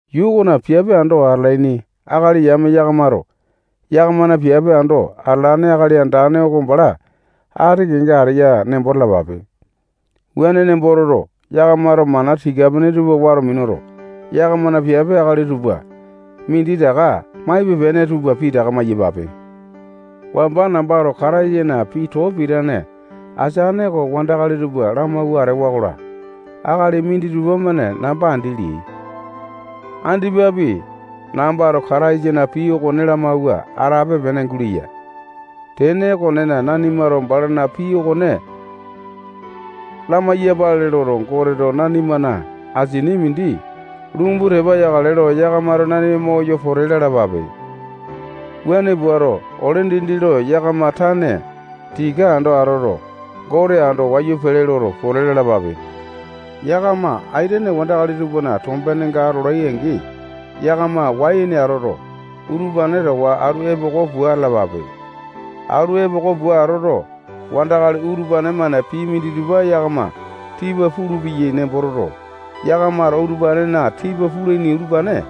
Yuu okona piape ando atalaini akali yame yakamato yakamana piape ando atalane Akali Andane oko bala ati kenga ateya nembo talapape. Wuane nembo toto, yakamato mana tika-pene tupa wato minuto, yakamana piape akali tupa minditaka maipe-pene tupa pitaka maiyapape. Wamba nambato Kataisana pii too pitane ateane oko wandakali tupa lamawua atewa-kola, akali minditupa-mane namba andi leai. Andipapi nambato Kataisana pii okone lamawua atape-pene guleya. Tene okonena, nanimato balana pii okone lamai-yapale loto, Goteto nanimana asini mindi lumbu tepa yakale lo, yakamato nanima moyo pote lalapape. Wuane puato, ole dindi lo yakama tane tika ando atoto, Gote ando wayu pele loto, pote lalapape. Yakama aitene wandakali tupana tombenenga atolai-angi, yakama wai ene atoto, utupane towa atu epoko pua atalapape. Atu epoko pua atoto, wandakali utupane-mane pii minditupa yakama tipa pulupeyai nembo toto, yakamato utupanena tipa pulaini utupane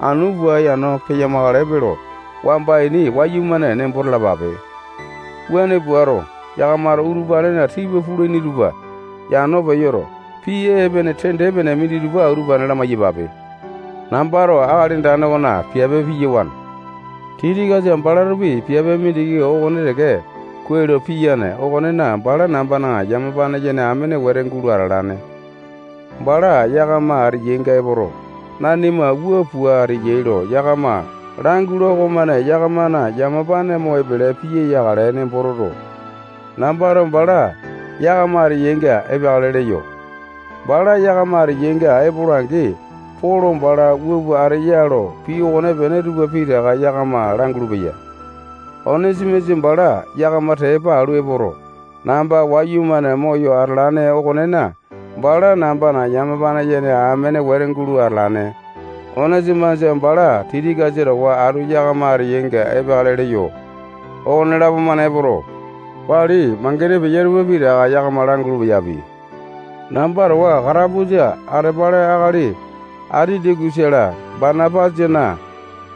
anu pua yano peyamakale yape lo wamba ini wayumane nembo talapape. Wuane puato, yakamato utupanena tipa pulaini tupa yano peyoto, pii epene tende-pene minditupa utupane lamai-yapape. Nambato Akali Andane okona piape piyawane. Tikikasa balatopi piape mindiki okone teke kuai lo piyane okonena, bala nambana yamapane yene amene wete gulo atalane. Bala yakama ateyainga epoto, nanima wua pua ateyai lo yakama langula okomane yakamana yamapane mo epele piya yakale nembo toto, nambato bala yakama ateyainga epeakale leyo. Bala yakama ateyainga epola-angi, Polo bala wua pua ateya lo pii okonepene tupa pitaka yakama langulu-peya. Onesimasa bala yakama tepa alu epoto, namba wayumane moyo atalane okonena, bala nambana yamapane yene amene wete gulo atalane. Onesimasa bala Tikikasa towa atu yakama ateyainga epeakale leyo. Okonelapo-mane epoto, wali mangene peya tupa pitaka yakama langulu-peyapi. Namba towa katapusa atepale akali Atitakusa-la, Banapasana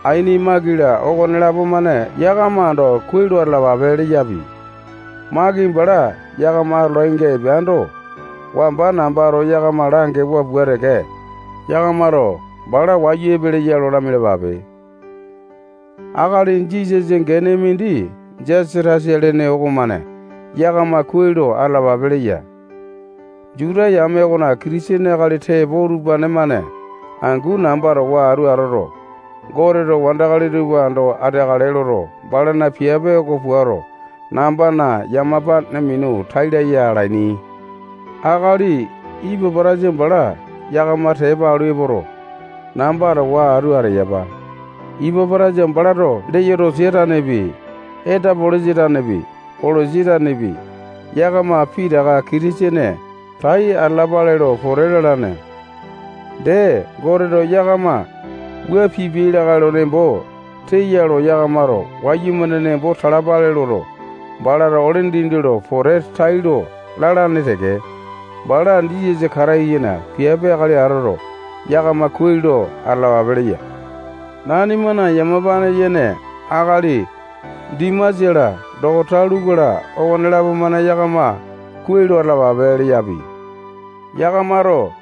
aini Maki-la, okonelapo-mane yakama ando kuai lo atalapape leyapi. Maki bala yakama atolainga epeando, wamba nambato yakama langewa pua teke, yakamato bala wayu epeleya lo lamialapape. Akali Jisasa gene mindi Jasatasa lene okomane yakama kuai lo atalapape leya. Juta yame okona Kitisene akali tepo utupane-mane angu namba towa atu atoto, Goteto wandakali tupa ando ateakale loto, balana piape oko puato, nambana yamapane minu tai laya alaini. Akali Ipapotasa bala yakama tepa alu epoto, namba towa atu ateyapa. Ipapotasa balato Leyotosia tanepi, Etapolisa tanepi, Kolosi tanepi, yakama pitaka Kitisene tai atalapale lo pote lalane. Dee, Goteto yakama wua pipiai lakae lo nembo teya lo yakamato wayumane nembo talapale loto, balato ole dindi lo pote tailo lalane teke. Bala Jisasa Kataisana piape akali atoto, yakama kuai lo atalapape leya. Nanimana yamapane yene akali Dimasa-la, dokosa Luku-la, okonelapo-mane yakama kuai lo atalapape leyapi. Yakamato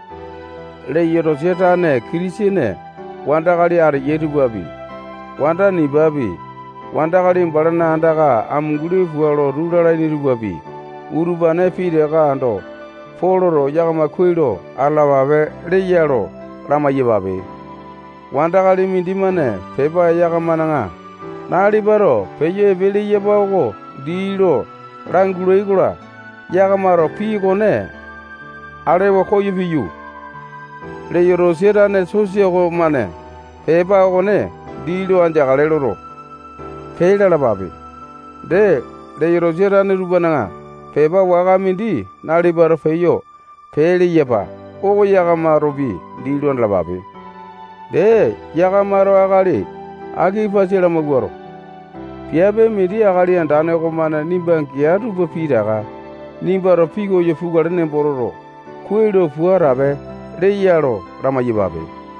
Leyotosia tane Kitisene wandakali ateyai tupapi, wanda Nipapi, wandakali balana andaka amunguli pua lotu lalaini tupapi, utupane pitaka ando Poloto yakama kuai lo atalapape leya lo lamai-yapape. Wandakali mindimane pepa yakamana nalipato peyo epe leyapa oko dii lo langula-kola, yakamato pii okone alewa koyo piyu, Leyotosia tane sosa okomane pepa okone dii lo andeakale loto, pee lalapape. Dee, Leyotosia tane tupana pepa waka mindi nalipato peyo pee leyapa oko yakamatopi dii lo andalapape. Dee, yakamato akali Akipasa lamawuato, piape mindi Akali Andane okomane nimba gea tupa pitaka nimbato pikoyo pukale nembo toto, kuai lo pua atape leya lo lamai-yapape.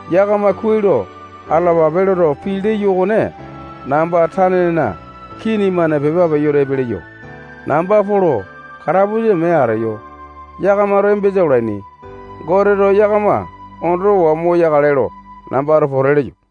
Yakama kuai lo atalapape loto, pii leyo okone namba tanena kii-mane pepa peyoto epe leyo. Namba Polo katapusa mee ateyo yakamato embesa olaini. Goteto yakama ondowa moyo ateakale lo nambato pote leyo.